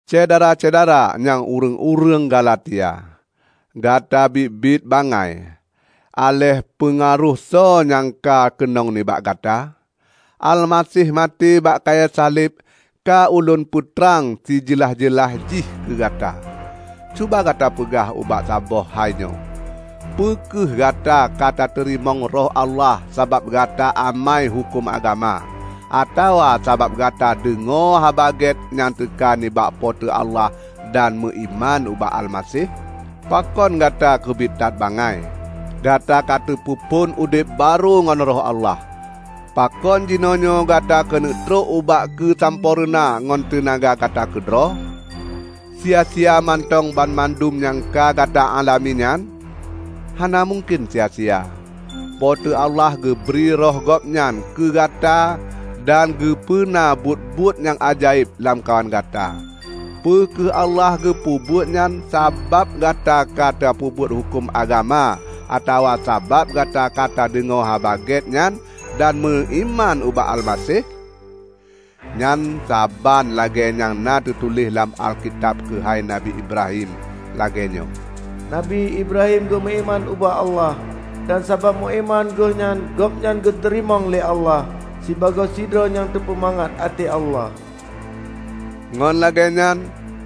Syedara-syedara nyang ureuëng-ureuëng Galatia! Gata biet-biet bangai! Aléh peungaroh soe nyang ka keunong nibak gata? Almaseh maté bak kayée saleb ka ulôn peutrang sijeulaih-jeulaih jih keu gata! Cuba gata peugah ubak saboh hai nyoe: Peu kheueh gata katateurimong Roh Allah sabab gata amai huköm agama, atawa sabab gata deungoe Haba Gét nyang teuka nibak Po teu Allah dan meuiman ubak Almaseh? Pakon gata keubiet that bangai! Gata ka tapeuphon udeb barô ngon Roh Allah, pakon jinoenyoe gata keuneuk trok ubak keusampoereuna ngon teunaga gata keudroe? Sia-sia mantong banmandum nyang ka gata alami nyan? Hana mungken sia-sia! Po teu Allah geubri Roh gobnyan keu gata dan geupeuna buet-buet nyang ajaéb lamkawan gata. Peu kheueh Allah geupeubuet nyan sabab gata ka tapeubuet huköm agama atawa sabab gata ka tadeungoe Haba Gét nyan dan meuiman ubak Almaseh? Nyan saban lagée nyang na teutuléh lam Alkitab keuhai Nabi Ibrahim -- lagée nyoe, "Nabi Ibrahim geumeuiman ubak Allah, dan sabab meuiman geuhnyan gobnyan geuteurimong lé Allah sibagoe sidroe nyang teupeumangat até Allah." Ngon lagée nyan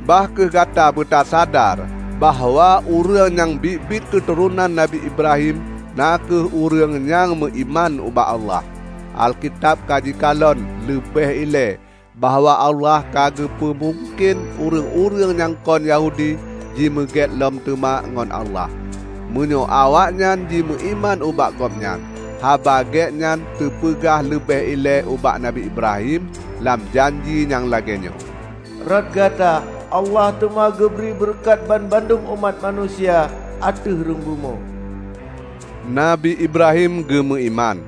bah kheueh gata beutasadar bahwa ureuëng nyang biet-biet keuturonan Nabi Ibrahim na kheueh ureuëng nyang meuiman ubak Allah. Alkitab ka jikalon leubeh ilée bahwa Allah ka geupeumungken ureuëng-ureuëng nyang kon Yahudi jimeugét lom teuma ngon Allah, meunyoe awaknyan jimeuiman ubak Gobnyan. Haba Gét nyan teupeugah leubeh ilée ubak Nabi Ibrahim lam janji nyang lagée nyoe, "Rot gata, Allah teuma geubri beureukat banmandum umat manusia ateueh rhueng bumoe." Nabi Ibrahim geumeuiman,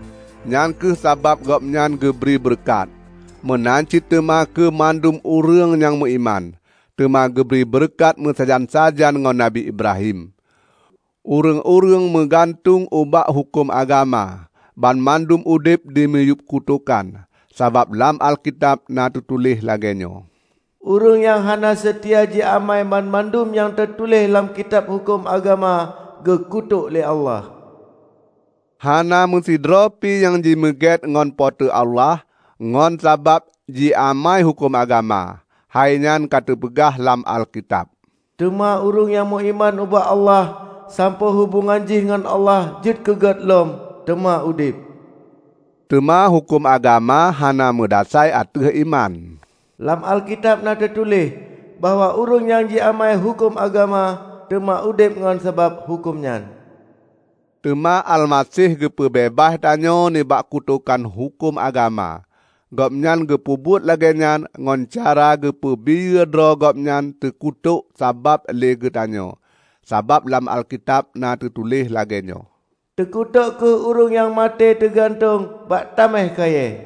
nyang kheueh sabab gobnyan geubri beureukat. Meunan cit teuma keu mandum ureuëng nyang meuiman, teuma geubri beureukat meusajan-sajan ngon Nabi Ibrahim. Ureuëng-ureuëng meugantueng ubak huköm agama, banmandum udeb dimiyueb kutokan. Sabab lam Alkitab na teutuléh lagée nyoe, "Ureuëng nyang hana seutia jiamai banmandum nyang teutuléh lam Kitab Huköm Agama, geukutôk lé Allah!" Hana meusidroe pi nyang jimeugét ngon Po teu Allah ngon sabab jiamai huköm agama. Hai nyan ka teupeugah lam Alkitab, "Teuma ureuëng nyang meuiman ubak Allah sampoe hubongan jih ngon Allah jeuet keugét lom, teuma udeb!" Teuma huköm agama hana meudasai ateueh iman. Lam Alkitab na teutuléh bahwa ureuëng nyang jiamai huköm agama, teuma udeb ngon sabab huköm nyan. Teuma Almaseh geupeubeubaih tanyoe nibak kutokan huköm agama. Gobnyan geupeubuet lagée nyan ngon cara geupeubiyeu droe Gobnyan teukutok sabab lé geutanyoe. Sabab lam Alkitab na teutuléh lagée nyoe, "Teukutok kheueh ureuëng nyang maté teugantueng bak taméh kayée."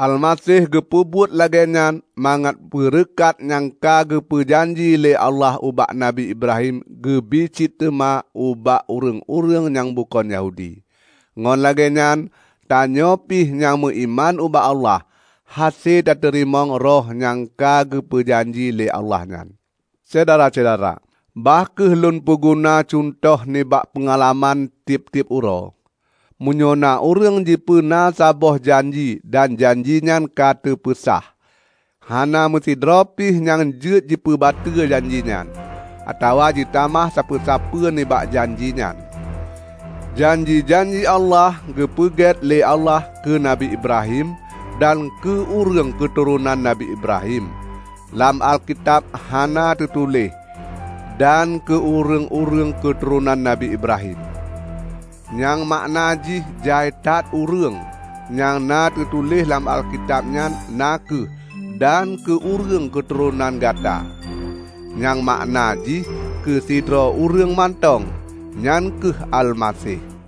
Almaseh geupeubuet lagée nyan mangat beureukat nyang ka geupeu janji lé Allah ubak Nabi Ibrahim geubri cit teuma ubak ureuëng-ureuëng nyang bukon Yahudi. Ngon lagée nyan tanyoe pih nyang meuiman ubak Allah, hase tateurimong Roh nyang ka geupeu janji lé Allah nyan. Syedara-syedara! Bah kheueh lôn peuguna cuntoh nibak peungalaman tieb-tieb uroe. Meunyoe na ureuëng jipeuna saboh janji dan janji nyan ka teupeusah, hana meusidroe pih nyang jeuet jipeubateu janji nyan, atawa jitamah sapeue-sapeue nibak janji nyan. Janji-janji Allah geupeugét lé Allah keu Nabi Ibrahim dan keu ureuëng keuturonan Nabi Ibrahim. Lam Alkitab hana teutuléh "dan keu ureuëng-ureuëng keuturonan Nabi Ibrahim", nyang makna jih jai that ureuëng. Nyang na teutuléh lam Alkitab nyan na kheueh, "dan keu ureuëng keuturonan gata", nyang makna jih keu sidroe ureuëng mantong, nyan kheueh Almaseh.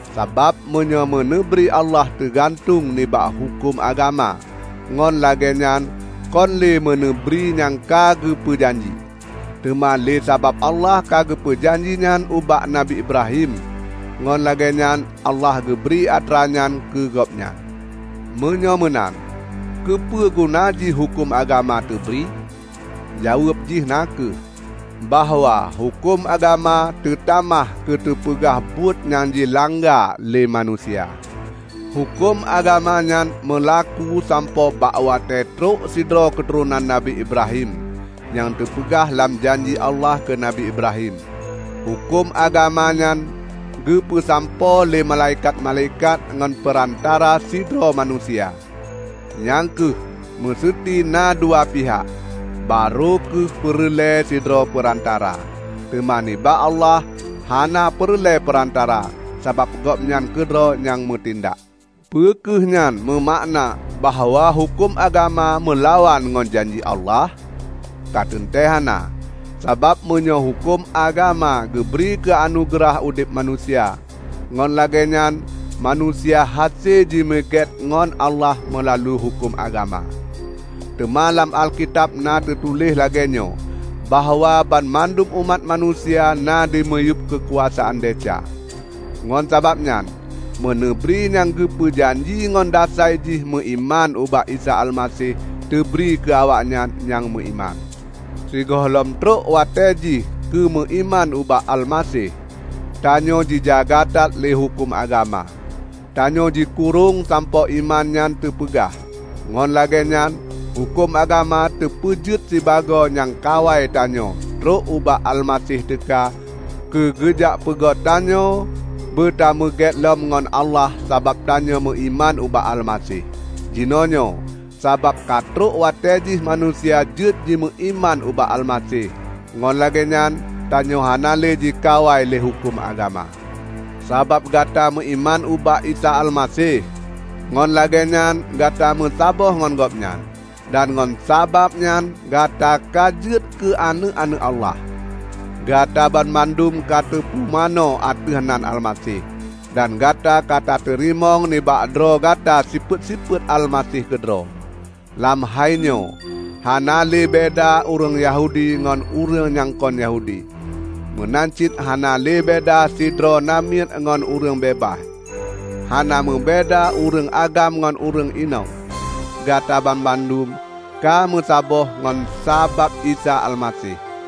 Sabab meunyoe meuneubri Allah teugantueng nibak huköm agama, ngon lagée nyan kon lé meuneubri nyang ka geupeu janji. Teuma lé sabab Allah ka geupeu janji nyan ubak Nabi Ibrahim, ngon lagée nyan Allah geubri atra nyan keu gobnyan. Meunyoe meunan, keupeuguna jih huköm agama teubri? Jaweueb jih na kheueh bahwa huköm agama teutamah keuteupeugah buet nyang jilangga lé manusia. Huköm agama nyan meulaku sampoe bak watée trok sidroe keuturonan Nabi Ibrahim, nyang teupeugah lam janji Allah keu Nabi Ibrahim. Huköm agama nyan geupeusampoe lé malaikat-malaikat ngon peurantara sidroe manusia. Nyang kheueh, meuseuti na dua pihak, barô kheueh peureulée sidroe peurantara. Teuma nibak Allah hana peureulée peurantara sabab Gobnyan keudroe nyang meutindak. Peu kheueh nyan meumakna bahwa huköm agama meulawan ngon janji Allah? Ka teuntée hana! Sabab meunyoe huköm agama geubri keu anugeurah udeb manusia, ngon lagée nyan manusia hase jimeugét ngon Allah meulalu huköm agama. Teuma lam Alkitab na teutuléh lagée nyoe bahwa banmandum umat manusia na dimiyueb keukuasaan desya. Ngon sabab nyan, meuneubri nyang geupeu janji ngon dasai jih meuiman ubak Isa Almaseh teubri keu awaknyan nyang meuiman. Sigohlom trok watée jih keumeuiman ubak Almaseh, tanyoe jijaga that lé huköm agama; tanyoe jikurong sampoe iman nyan teupeugah. Ngon lagée nyan, huköm agama teupeujeuet sibagoe nyang kawai tanyoe trok ubak Almaseh teuka keu geujak peugét tanyoe beutameugét lom ngon Allah sabab tanyoe meuiman ubak Almaseh. Jinoenyoe, sabab ka trok watée jih manusia jeuet jimeuiman ubak Almaseh, ngon lagée nyan tanyoe hana lé jikawai lé huköm agama. Sabab gata meuiman ubak Isa Almaseh, ngon lagée nyan gata meusaboh ngon Gobnyan; dan ngon sabab nyan gata ka jeuet keu aneuëk-aneuëk Allah. Gata banmandum ka teupumanö ateueh nan Almaseh, dan gata ka tateurimong nibak droe gata sifeuet-sifeuet Almaseh keudroe. Lam hai nyoe hana lé beda ureuëng Yahudi ngon ureuëng nyang kon Yahudi, meunan cit hana lé beda sidroe namiet ngon ureuëng beubaih, hana meubeda ureuëng agam ngon ureuëng inong. Gata banmandum ka meusaboh ngon sabab Isa Almaseh.